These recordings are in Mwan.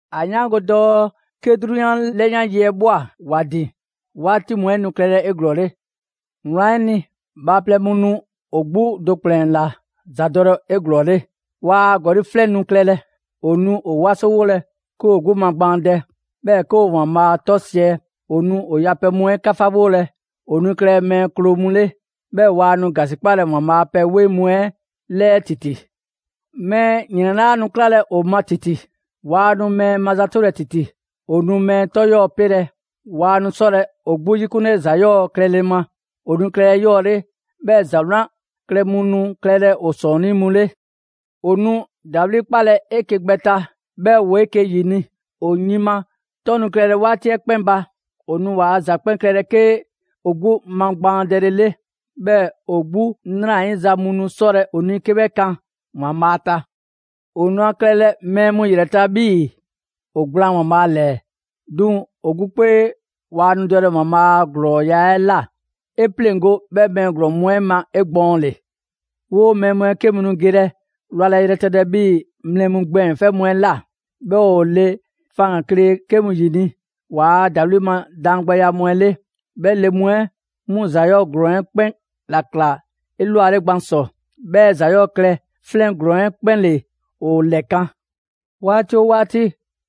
‑A 'yaango‑ dɔɔ 'ke 'drunyan 'lɛyan yi 'ɛ ꞊bhwa ‑wa ‑din, 'waati mu 'ɛ nu klɛlɛ 'eglɔɔle. Wlan 'ɛ ni, bhaaplɛŋ mu nu ‑o 'gbu do ‑kplɛn ‑la ‑zadɔlɛ 'eglɔɔle; ‑waa' ‑gɔli' 'flɛn nu klɛlɛ, ‑o nu ‑o 'wasowolɛ 'ke ‑woo 'gbu magbaandɛ, 'bhɛɛ‑ 'ke ‑o ‑Waanbhaa' 'tɔ siɛ. ‑O nu ‑o yapɛ mu 'ɛ 'kafawolɛ, ‑o nu klɛlɛ mɛɛ kloo mu 'le; 'bhɛɛ‑ waa nu ‑gasikpalɛ ‑Waanbhaa' a pɛ 'weŋ mu 'ɛ 'lɛɛ ‑titi. Mɛɛ ‑yrɛn 'laa nu 'klalɛ‑ ‑o ma ‑titi; ‑waa nu mɛɛ mazatolɛ ‑titi; ‑o nu mɛɛ 'tɔ 'yɔɔ‑ 'pelɛ‑. Waa nu 'sɔlɛ‑ ‑o 'gbu 'yikunle ‑za 'yɔɔ‑ klɛle ma, ‑o nu klɛlɛ 'eyɔɔle, 'bhɛɛ‑ ‑za 'wlan klɛ mu nu klɛlɛ ‑o ‑sɔɔnnii' mu 'le. ‑O nu ‑dawli' 'kpalɛ‑ 'eke‑ gbɛ ta 'bhɛɛ‑ ‑woo 'eke‑ ‑yini'; ‑o yin ma 'tɔn nu klɛlɛ 'waati 'ɛ 'kpɛn ba, ‑o nu ‑waa' ‑za 'kpɛn klɛlɛ 'ke ‑o 'gbu magbaandɛlele. 'Bhɛɛ‑ ‑o 'gbu 'nrayiza mu nu 'sɔlɛ‑ ‑o ni 'ke 'bhɛ kan ‑Waanbhaa' ta. ‑O nu ‑a klɛlɛ mɛɛ mu ‑yrɛ ta 'bhii‑ ‑o gblaan ‑Waanbhaa' ‑lɛɛ, 'duŋ‑ ‑o 'gbu 'kpee waa nu dɔlɛ ‑Waanbhaa' a ‑glɔɔya' 'ɛ ꞊la. 'E 'pleŋgo‑ 'bhɛ mɛɛ ‑glɔɔn mu 'ɛ ma 'egbɔɔnle. 'Woo‑ mɛɛ mu 'ɛ 'ke mu ge wlalɛ yrɛtɛtɛ 'bhii‑ mlɛ mu gbɛɛn‑ 'fɛ mu 'ɛ ꞊la, 'bhɛɛ‑ ‑o le faŋgan‑ kle 'ke mu ‑yini' ‑waa' ‑dawli' ma daangbɛya mu 'ɛ 'le; 'bhɛ le mu 'ɛ 'mu ‑za 'yɔɔ‑ ‑glɔɔn 'ɛ 'kpɛn ‑la ‑kla 'elwale gban ‑sɔ, 'bhɛɛ‑ ‑za 'yɔɔ‑ klɛ 'flɛn ‑glɔɔn 'ɛ 'kpɛn ‑le ‑o ‑lɛkan'. 'Waati oo 'waati,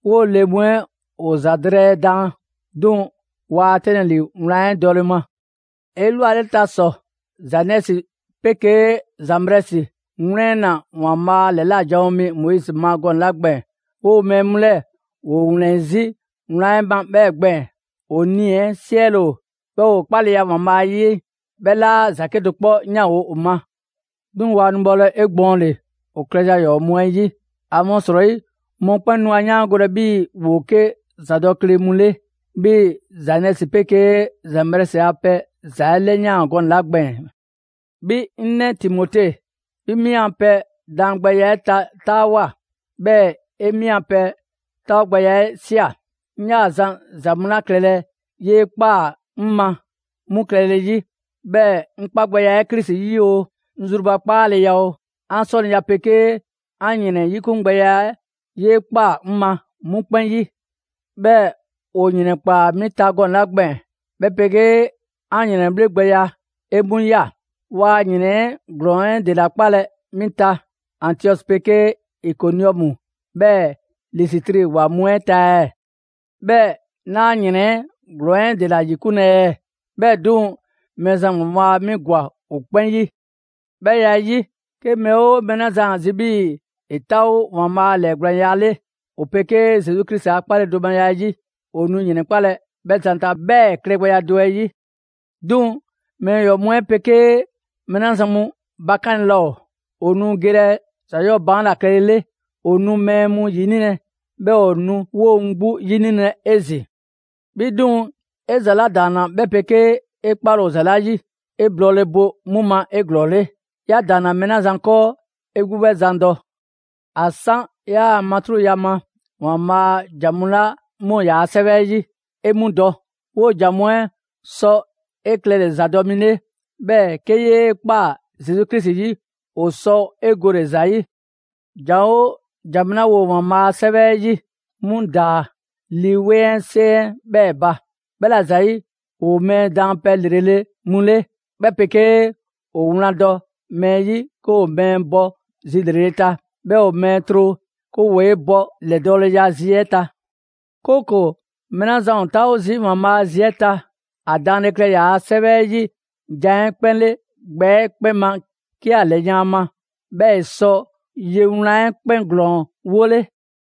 'woo‑ le mu 'ɛ ‑o ‑za drɛɛ daan, 'duŋ‑ waa 'tɛnlɛ‑ ‑li wlan 'ɛ dɔle ma. 'Elwaleta ‑sɔ Zanɛsi 'pegee Zanbrɛsi ‑wlɛnna ‑Waanbhaa' ‑lɛla' janwo mi Moizi ma gɔnɛ‑ 'la gbɛɛn‑, 'woo‑ mɛɛ mu 'lɛɛ‑, ‑woo ‑wlɛn 'zi wlan 'ɛ ma 'bhɛɛ‑ gbɛɛn‑; ‑o nii‑ 'ɛ 'siɛle‑ ‑o, 'bhɛɛ‑ ‑o 'kpaleya ‑Waanbhaa' 'yi 'ɛ 'bhɛ 'laa ‑za 'kedo‑ 'kpɔ 'yanwo‑ ‑o ma. 'Duŋ‑ waa nu bhɔlɛ 'egbɔɔnle ‑o klɛza mu 'ɛ 'yi, ‑amasrɔyi mɔkpɛn' nu ‑a 'yaangolɛ 'bhii‑ ‑woo 'ke ‑zadɔkle mu 'le, 'bhii‑ Zanɛsi 'pegee Zanbrɛsi a pɛ ‑za 'ɛ 'lɛyaan‑ gɔnɛ‑ 'la gbɛɛn‑. 'Bhi 'ŋ 'nɛ Timote, 'bhi 'mi 'an pɛ daangbɛya 'ɛ ta 'taawoa꞊, 'bhɛɛ‑ 'e 'mi a pɛ 'taawogbɛya 'ɛ ꞊sia. 'Ŋ 'yaa‑ zan ‑za mu 'la klɛlɛ 'yee ꞊kpaa 'ŋ ma 'mu klɛle 'yi, 'bhɛɛ‑ 'ŋ 'kpagbɛya 'ɛ Krisi 'yi oo, 'ŋ zrubakpaaleya oo, 'an 'sɔniya 'pegee 'an ‑yrɛn 'yikungbɛya 'ɛ 'yee ꞊kpaa 'ŋ ma 'mu 'kpɛn 'yi. 'Bhɛɛ‑ ‑o ‑yrɛnkpaa 'mi ta gɔnɛ‑ 'la gbɛɛn‑, 'bhɛ 'pegee 'an ‑yrɛnbhle' gbɛya, 'e 'mu ‑ya. Waa ‑yrɛn 'ɛ ‑glɔɔn 'ɛ ‑dela 'kpalɛ‑ 'mi ta Antiɔsi 'pegee Ikoniɔmu 'bhɛɛ‑ Lisitri ‑wa mu 'ɛ ta ɛɛ? 'Bhɛɛ‑ 'naa ‑yrɛn 'ɛ ‑glɔɔn 'ɛ ‑dela ‑yikunlɛ ɛɛ? 'Bhɛɛ‑ 'duŋ‑ Mɛɛzan ‑Waanbhaa' 'mi ‑gwa ‑o 'kpɛn 'yi. 'Bhɛ ya 'ɛ 'yi, 'ke mɛɛ 'oo mɛɛ 'la zan ‑a zi' 'bhii‑ ‑e 'taawo ‑Waanbhaa' a ‑lɛɛgblaanya 'le ‑o 'pegee Zesu Krisi 'kpaledomaya 'ɛ 'yi, ‑o nu ‑yrɛnkpalɛ 'bhɛ zan ta 'bhɛɛ‑ klɛgbɛya do 'ɛ 'yi. 'Duŋ‑ mɛɛ ‑yɔɔ mu 'ɛ 'pegee mɛɛ 'la zan mu bakanle laa ‑o, ‑o nu gelɛ ‑za 'yɔɔ‑ baan' ‑la klɛlele, ‑o nu mɛɛ mu ‑yinilɛ, 'bhɛɛ‑ ‑o 'woo‑ mu 'gbu 'yinilɛ 'ezin‑. 'Bhi 'duŋ‑, 'e ‑za 'la ‑daanna 'bhɛ 'pegee 'e 'kpale‑ ‑o ‑za 'la 'yi, 'e blɔɔle bo 'mu ma 'eglɔɔle. 'Ya ‑daanna mɛɛ 'la zan 'kɔɔ, 'e 'gbu 'bhɛ zan dɔ. ‑A 'san 'yaa‑ matruŋya ma, ‑Waanbhaa' a ‑jan mu 'la 'mu ‑o yaa' 'Sɛwɛ 'ɛ 'yi, 'e 'mu dɔ. 'Woo‑ ‑jan mu 'ɛ sɔ 'e klɛle‑ ‑zadɔ' mi 'le, 'bhɛɛ‑ 'ke 'yee‑ ꞊kpaa Zesu Krisi 'yi, ‑o sɔ 'e gole‑ ‑za 'yi. ‑Jan 'oo ‑jan mu 'la ‑woo ‑Waanbhaa' a 'sɛwɛ 'ɛ 'yi, 'mu ‑daa Lii 'Weŋ 'ɛ 'seŋ 'ɛ 'bhɛɛ‑ ba. 'Bhɛla‑ ‑zayi', ‑woo mɛɛ daanpɛ ‑lrele' mu 'le, 'bhɛ 'pegee ‑o wlan dɔ mɛɛ 'yi 'ke ‑o mɛɛ bɔ zi ‑lrele' ta, 'bhɛɛ‑ ‑o mɛɛ tro 'ke ‑woo 'e bɔ ‑lɛdɔɔleya zi 'ɛ ta. 'Kooko‑ mɛɛ 'la zan ‑o 'taawo zii' ‑Waanbhaa' a zi 'ɛ ta, ‑a daanle klɛ ‑yaa' 'Sɛwɛ 'ɛ 'yi jan 'ɛ 'kpɛn 'le gbɛ 'ɛ 'kpɛn ma 'ke ‑a ‑lɛyan' ‑a ma, 'bhɛɛ‑ ‑e sɔ ye wlan 'ɛ 'kpɛn ‑glɔɔn 'wole.